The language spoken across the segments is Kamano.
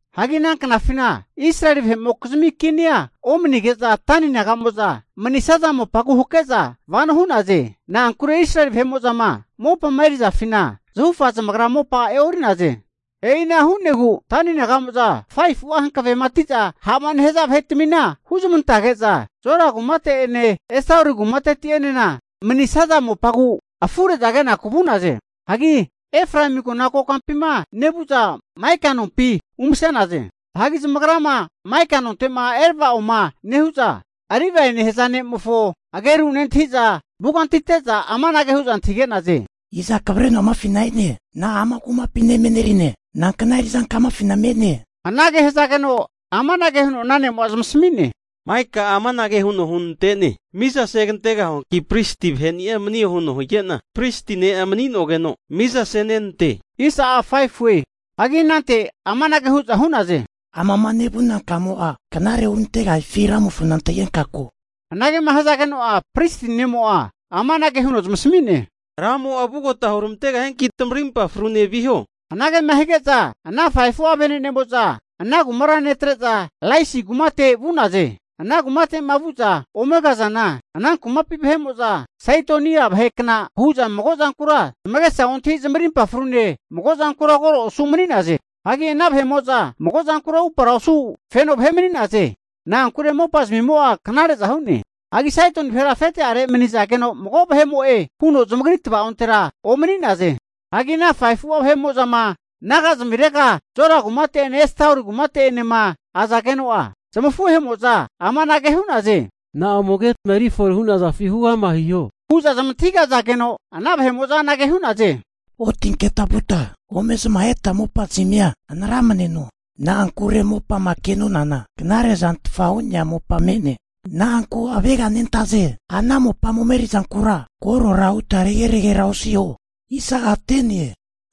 Hagi ana knafina Israeli vahe'mokizmi kinia omani'nege'za Dani naga'mo'za manisaza mopagu hake'za vano hu'naze. Na'ankure Israeli vahe'mo'zama mopama erizafina zahufa zamagra mopa e'ori'naze. E'ina hu'negu Dani naga'mo'za 5fu'a hankavematiza ha'ma nehaza vahetamina huzmantazage'za Zora kumate'ene Estaoli kumateti'enena manisaza mopagu afure'za kenaku vu'naze. Hagi Efraemi agona kokampima nevu'za, Maika nompi umase'naze. Hagi zamagrama Maika nonte'ma erava'oma nehu'za, Livae nehaza ne'mofo ageru nentahi'za vugantite'za amanage hu'za antahige'naze. Iza kavreno amafina e'ne? Na'a ama kumapina emenerine? Nankna eri'zanka'a amafina me'ne? Anage hazageno amanage huno ana ne'mo'a zamasami'ne, Maika'a amanage huno hunante'ne, mizasegantegahuanki pristi vaheni'a manio huno hige'na, pristi ne'a mani'nogeno mizasenenante. Hagi anante amanage hu'za hu'naze, Amama nevuna kamo'a knare hurantegahifi Ramofona antahigenka ko. Anagema hazageno'a pristi ne'mo'a amanage huno zamasami'ne, Ramo'a vugota huramantegahianki tamarimpa frune viho. Anagema hige'za ana 5fu'a vene'nemo'za ana kumara netre'za Laisi kumate vu'naze. Ana kumate'ma vu'za ome kazana, ana kumapi vahe'mo'za Saidoni vahe kna hu'za magozankura zamagesa ontahi zamarimpa frune mago zankura koro osu' mani'naze. Hagi ana vahe'mo'za mago zankura upara osu feno vahe mani'naze. Na'ankure mopazmimo'a knare'za hu'ne. Hagi Saidoni vahera afete'are mani'nazageno mago vahe'mo'e huno zamagri tavaontera omani'naze. Hagi ana 5fu'a vahe'mo'zama nagazmirega Zora kumate'ene Estaoli kumate'enema azageno'a, zamafuhemo'za amanage hu'naze. Na'a ome ketma erifore hu'nazafi huama hiho? Hu'za zamantahigazageno, ana vahe'mo'za anage hu'naze, otinketa vuta ome zamaheta mopazmia hanaramneno! Na'ankure mopama ke'nonana knare'zantfa hu'nea mopa me'ne. Na'anku aveganentaze? Ana mopama omerizankura korora huta rege'regera osiho.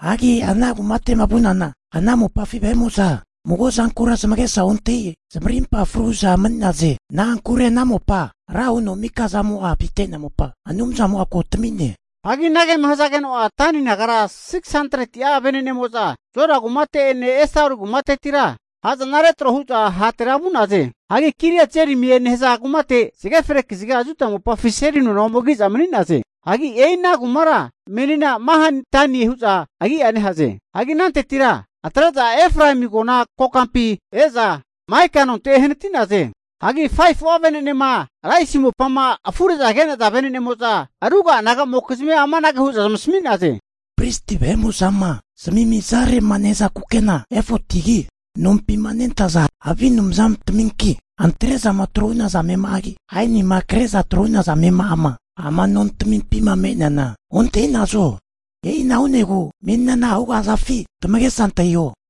Hagi ana kumate'ma vu'nanana ana mopafi vahe'mo'za mago'zankura zamagesa ontahi zamarimpa fru hu'za mani'naze. Na'ankure ana mopa ra huno mikazamo'a avite'nea mopa Anumzamo'a ko tami'ne. Hagi anagema hazageno'a Dani nagara 600'a venenemo'za Zora kumateti'ene Estaoli kumatetira ha'zana retro hu'za hatera vu'naze. Hagi Kiriat-jearimie nehaza kumate zage fre kaziga Juda mopafi seli nona ome ki'za mani'naze. Hagi e'ina kumakura menina Mahane-Danie hu'za agia nehaze. Hagi anantetira atre'za Efraemi agona kokampi e'za, Maika nonte ehanati'naze. Hagi 5fu'a vene'nema Laisi mopama afure'za ke'naza vene'nemo'za ruga'a naga'mokizmia amanage hu'za zamasami'naze. Pristi vahe'mo'zama zamimizare'ma nehaza kukena efotigi, nompima nentaza havi anumzantaminki, antre'zama tro'ma hu'naza amema'agi, aenima kre'za tro'ma hu'naza amema'ama ama nontamimpima me'neana ontahi'nazo. E'ina hu'negu menina na'a hugahazafi tamagesa antahiho?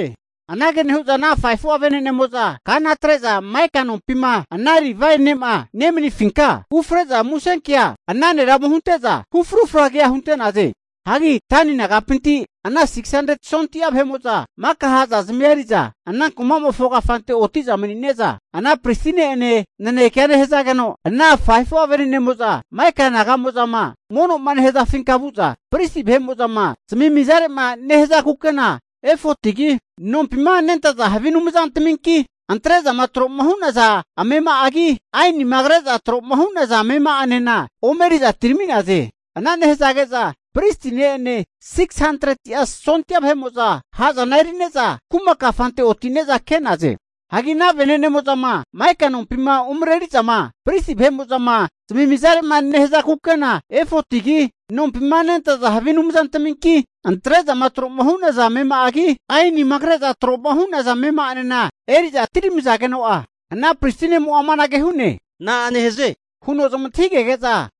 Anage nehu'za ana 5fu'a vene'nemo'za kana atre'za, Maika nompima ana Livaie ne'ma nemanifinka ufre'za musenkea ana nera ome hunte'za, hufrufra kea hunte'naze. Hagi Dani nagapinti ana 600'a sondia vahe'mo'za maka ha'zazmia eri'za ana kumamofo kafante oti'za mani'ne'za, ana pristi ne'ene nanekea nehazageno, ana 5fu'a venenemo'za Maika naga'mo'zama mono'ma nehazafinka vu'za pristi vahe'mo'zama zamimizare'ma nehaza kukena efotigi, nompima nentaza havi anumzantaminki, antre'zama tro'ma hu'naza amema'agi, aenima kre'za tro'ma hu'naza amema'anena omeri'za atirami'naze. Ana nehazage'za pristi ne'ene 600'a sondia vahe'mo'za ha'zana eri'ne'za kuma kafante otine'za ke'naze. Hagi ana venenemo'zama Maika nompima umreri'zama pristi vahe'mo'zama zamimizare'ma nehaza kukena efotigi, nompima nentaza havi anumzantaminki, antre'zama tro'ma hu'naza amema'agi, aenima kre'za tro'ma hu'naza amema'anena eri'za atiramizageno'a, ana pristi ne'mo'a amanage hu'ne, na'a nehaze? Huno zamantahigege'za,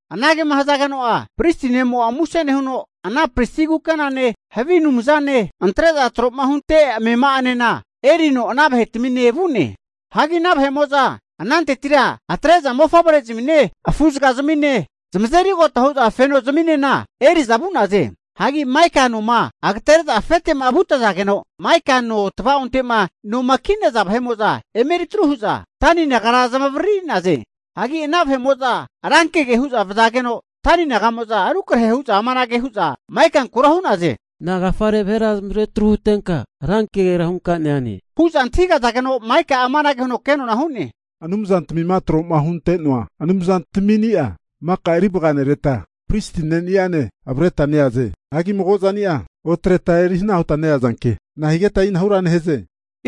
Anagema hazageno'a pristi ne'mo'a muse nehuno ana pristi kukenane, havi anumzane, antre'za trohunte amema'anena erino ana vahe'tamine vu'ne. Hagi ana vahe'mo'za anantetira antre'za mofavrezmine afuzagazmine zamazerigota hu'za fenozazminena eri'za vu'naze. Hagi Maika noma agatere'za afete'ma vutazageno'a, Maika no tavaonte'ma noma ki'naza vahe'mo'za emeritru hu'za Dani nagara zamavariri'naze. Hagi ana vahe'mo'za rankege hu'za vazageno Dani naga'mo'za rukrahe hu'za amanage hu'za Maikankura hu'naze, Nagafare vahera zamavaretru huntenka, rankegera hunka neane? Hu'za antahigazageno, Maika'a amange huno kenona hu'ne, anumzantamima tro'ma hunte'noa anumzantamini'a maka eri vaganereta pristi ne'nianena avreta neaze. Hagi mago zani'a otreta eri hana huta neazanki, nahigeta e'inahura nehaze?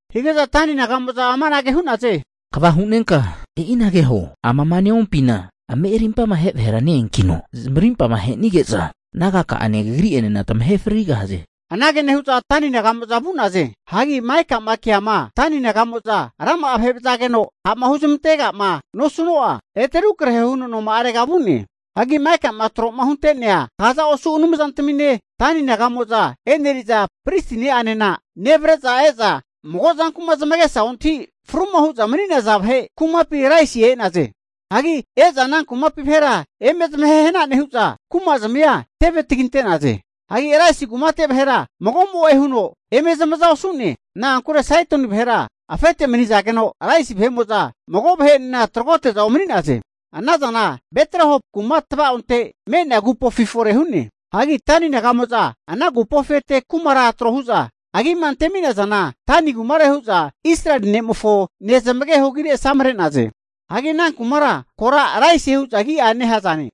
Hige'za Dani naga'mo'za amanage hu'naze, Kva hunenka e'inagea huo! Amama neompina ame arimpama ahe vahera neankino, zamarimpama ahenige'za nagaka'ane kagri'enena tamahe frigahaze. Anage nehu'za Dani naga'mo'za vu'naze. Hagi Maika'ma keama Dani naga'mo'za rama'a vahe'ma vazageno ha'ma huzamantega'ma nosuno'a ete rukrahe huno noma'arege vu'ne. Hagi Maikama tro'ma hunte'nea kaza osu anumzatamine, Dani naga'mo'za e'neriza pristi ne'anena nevre'za eza mago zanku'ma zamagesa ontahi fruma hu'za mani'naza vahe kumapi Laisi e'naze. Hagi eza ana kumapi vahera eme zamahehna nehu'za, kumazimia teve taginte'naze. Hagi Laisi kumate vahera mago'mo'e huno eme zamaza osu'ne. Na'ankure Saidoni vahera afete manizageno, Laisi vahe'mo'za mago vahe'enena tragote'za omani'naze. Ana zana Beth-Rehob kuma tava'onte me'nea agupofi fore hu'ne. Hagi Dani naga'mo'za ana agupofi ete kumara trohuza agima anteminazana Dani kumare hu'za Israeli nemofo nezmageho agire asamre'naze. Hagi ana kumakura kora Laisie hu'za agia nehazane.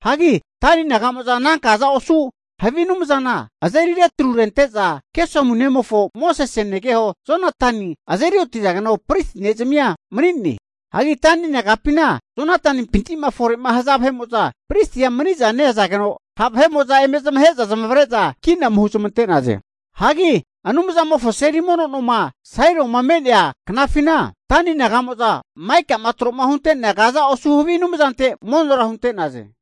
Hagi Dani naga'mo'za ana kaza osu havi anumzana azeri retrurente'za, Gesomu nemofo Mosese negeho Jonatani azeri otizageno pristi ne'zimia mani'ne. Hagi Dani nagapina Jonatanimpinti'ma fore'ma haza vahe'mo'za pristia maniza neazageno, ha' vahe'mo'za eme zamahe'za zamavare'za kina ome huzamante'naze. Hagi Anumzamofo seli mono nomo'ma Sailoma me'nea knafina, Dani naga'mo'za Maika'ma tro hunte'nea kaza osu havi anumzante monora hunte'naze.